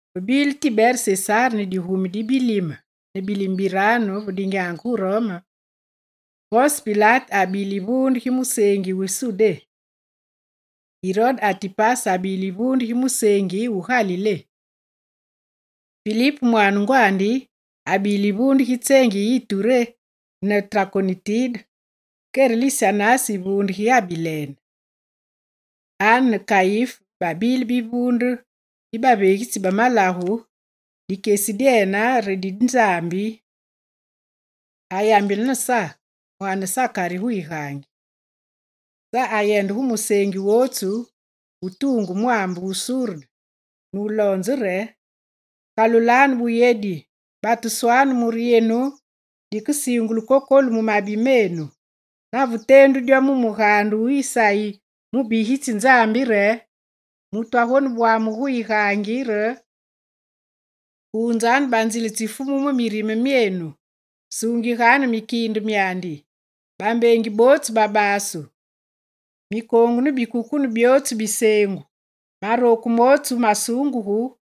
Ve bile Tibere Sesar ne digumi di bilime ne bilime biranu ve dinyaange gu Rome, Ponse Pilate abile yivuunde gi museengi wu Sudé, ne Irode Atipase abile yivuunde gi museengi wu Galilé; Filip mwaane ngwandi, abile yivuunde gi tseengi yi Ituré ne Trakonitide, kere Lisanyas yivuunde gi Abilene. Ane ne Kayif babile bivuunde bi baveegitsi ba malagu, dikyesi dyene re di Nzambi ayambile ne Sa mwaane Sakari gu yigaangi. Sa ayendenge gu museengi wotsu wu mu tuungu mwaambe wu Surde nuloonzenge re: «Kalulanu buyedi, batuswanu mure yenu dikesiingulu kokolu mu mabi menu.» Nave teendu dyo mu mugaande wu Isayi mubigitsi Nzambi re: «Mutu agonebwamugu gu yigaangi re kuunzanu banzile tsi Fumu mu mirime myenu, suungiganu mikiinde myandi. Bambeengi bootsu babasu, mikoongu ne bikukune byootsu biseengu, marooku mootsu masuungugu,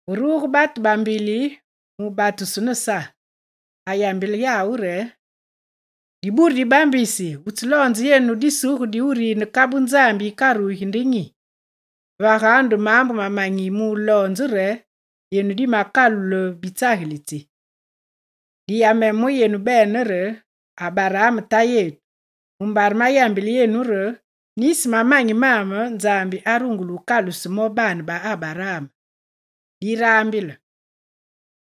Ve ruge batu ba mbili mubatusu ne Sa, ayambile yawu re: «Dibure dibambisi wutseloonze yenu disuge diwurine kabu Nzambi yikarugi nde nyi? Vaganu nde maambu mamanyi muloonze re yenu dimakalule bitsagilitsi. Diyameme mu yenu bene re Abaraam tayetu, mumbare mayambile yenu re, nisi mamanyi maame Nzambi arungule wukaluse mo baane ba Abaraam. Diraambile,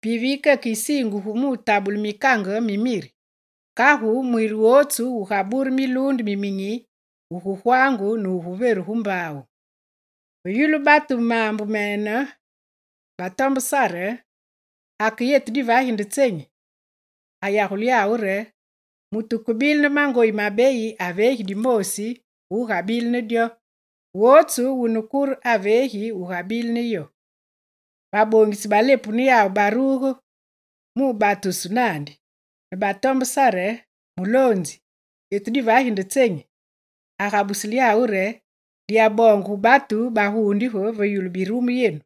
pivi yikeke yisiingugu mutabule mikange mi miri; kagu mwiri wotsu wugabure miluunde miminyi wugugwaangu ne wuveru gu mbaawu.» Ve yulu mbili batu maambu mene batombenge Sa re: «Ake yetu divagi nde tsenyi?» Ayagule yawu re: «Mutu wukebile ne mangoyi mabeyi aveegi dimoosi gu wugabile ne dyo, wotsu wune kure, aveegi wugabile ne yo.» Baboongitsi ba lepu ne yawu baruge mubatusu naandi, ne batombe Sa re: «Muloonzi yetu divagi nde tsenyi?» Agabusile yawu re: «Diyaboonge gu batu bagundige ve yulu birumu yenu.»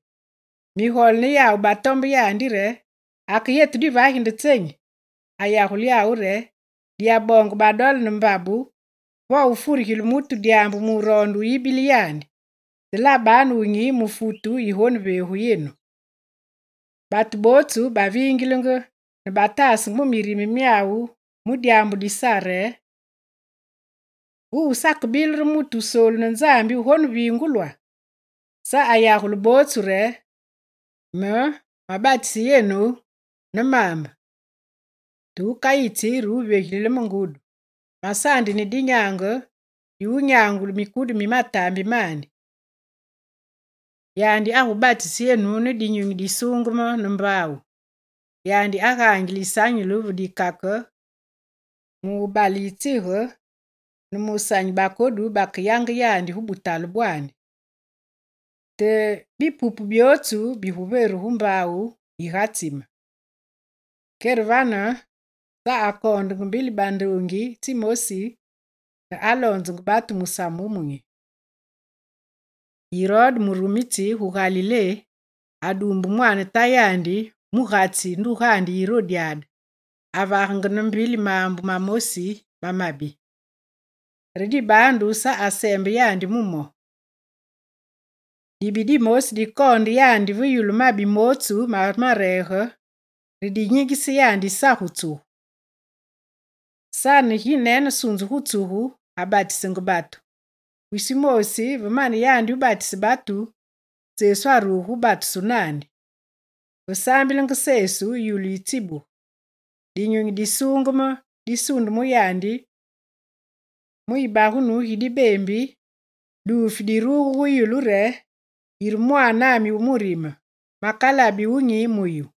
Migole ne yawu batombe yandi re: Ake yetu divage nde tsenyi? Ayagule yawu re: «Diyaboonge badole ne mbabu, vo wufurigile mutu dyaambu muroonde wuyibile yandi, te labanu wunyi mu futu yigoneveegu yenu.» Batu bootsu baviingilenge, ne bataasange mu mirime myawu mu dyaambu di Sa re: «Wuwu sakebile re mutu Wusoolu ne Nzambi wugoneviingulwa?» Sa ayagule yawu bootsu re: «Me, mabatise yenu ne maambe, te wukayitsi re wuvyogilile me Ngudi. Masaandi ne dinyaange di wunyangule mikudu mi mataambi mandi. Yandi agubatise yenu ne Dinyunyi Disuungeme, ne mbaawu. Yandi agaangile yisanyulu ve dikake mubale yitsige ne mu wusanyi bakodu bakeyange yandi gu butale bwandi. Te bipupu byootsu biguveru gu mbaawu yigatsime.» Kere vane Sa akoonde mbili bandoongi tsimosi nuloonzenge batu musamu wumunyi. Irode murumitsi gu Galilé aduumbe mwaane tayandi mugatsi ndugandi Irodyade, avagenge ne mbili maambu mamosi mamabi. Re dibaandu Sa aseembe yandi mu mo. Dibi dimosi dikoonde yandi ve yulu mabi mootsu ma mareege re dinyingise yandi Sa gu tsugu. Sa ne ginene sunzu gu tsugu, abatisenge batu. Wisi wumoosi ve mane yandi wubatise batu, Sesu aruge gu batusu naandi. Ve saambilenge Sesu, yulu yitsibuge. Dinyunyi Disuungeme disunde mu yandi mu yibagunu gi dibeembi, duufi diruge gu yulu re: «Yire Mwaanami wu murime, makalabi wunyi mu yu.»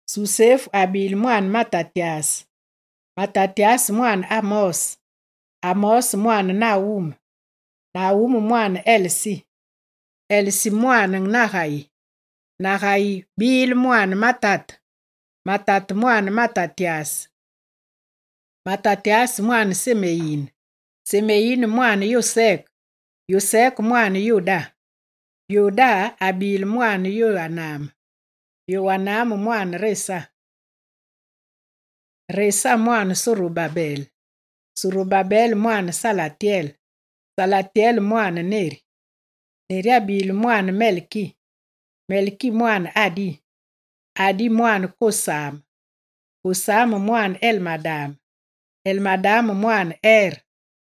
Susefu abile mwaane Matatyas, Matatyas mwaane Amose, Amose mwaane Nawume, Nawume mwaane Esli, Esli mwaane Nagayi; Nagayi bile mwaane Mate, Mate mwaane Matatyas, Matatyas mwaane Semeyé, Semeyé mwaane Yoseke, Yoseke mwaane Yoda. Yoda abile mwaane Yowana, Yowana mwaane Resa, Resa mwaane Sorobabele, Sorobabele mwaane Salatyele, Salatyele mwaane Neri. Neri abile mwaane Melki, Melki mwaane Adi, Adi mwaane Kosame, Kosame mwaane Elmadame, Elmadame mwaane Ere.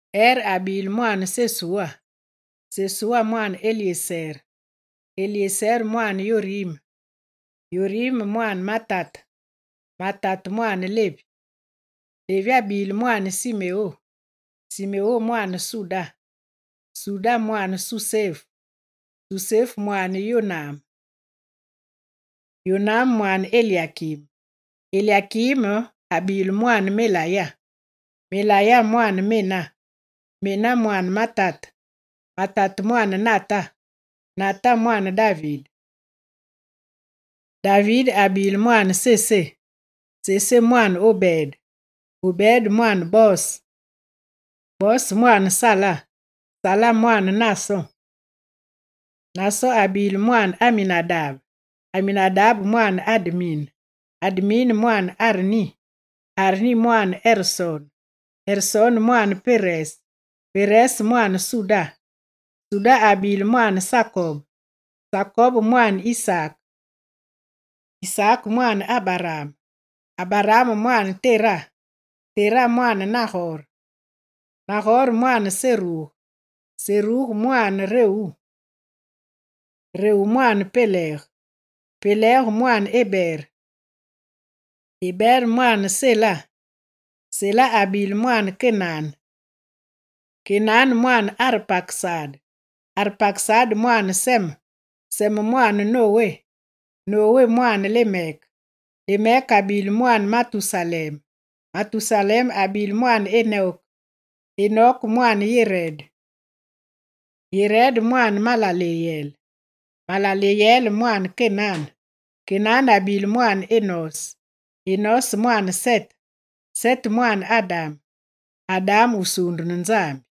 Ere abile mwaane Sesu, Sesu mwaane Elyesere, Elyesere mwaane Yorime, Yorime mwaane Matate, Matate mwaane Levi. Levi abile mwaane Simeo, Simeo mwaane Suda, Suda mwaane Susefu, Susefu, mwaane Yoname, Yoname mwaane Elyakim. Elyakim abile mwaane Meleya, Meleya mwaane Mena, Mena mwaane Matate, Matate mwaane Nata, Nata mwaane David. David abile mwaane Isayi, Isayi mwaane Obed, Obed mwaane Bose, Bose mwaane Sala, Sala mwaane Naason. Naason abile mwaane Aminadabe, Aminadabe mwaane Admin, Admin mwaane Arni, Arni mwaane Ersone, Ersone mwaane Perese, Perese mwaane Suda, Suda abile mwaane Sakob, Sakob mwaane Isaak, Isaak mwaane Abaraam, Abaraam mwaane Tera, Tera mwaane Nagore. Nagore mwaane Seruge, Seruge mwaane Rewu, Rewu mwaane Falek, Falek mwaane Ebere, Ebere mwaane Sala. Sala abile mwaane Kénane, Kénane mwaane Arpakesade, Arpakesade mwaane Seme, Seme mwaane Nowé, Nowé mwaane Lemek. Lemek abile mwaane Matusalem, Matusalem abile mwaane Enok, Enok mwaane Yerede, Yerede mwaane Malele, Malele mwaane Kénane. Kénane abile mwaane Enose, Enose mwaane Sete, Sete mwaane Adam, Adam wusuundu ne Nzambi.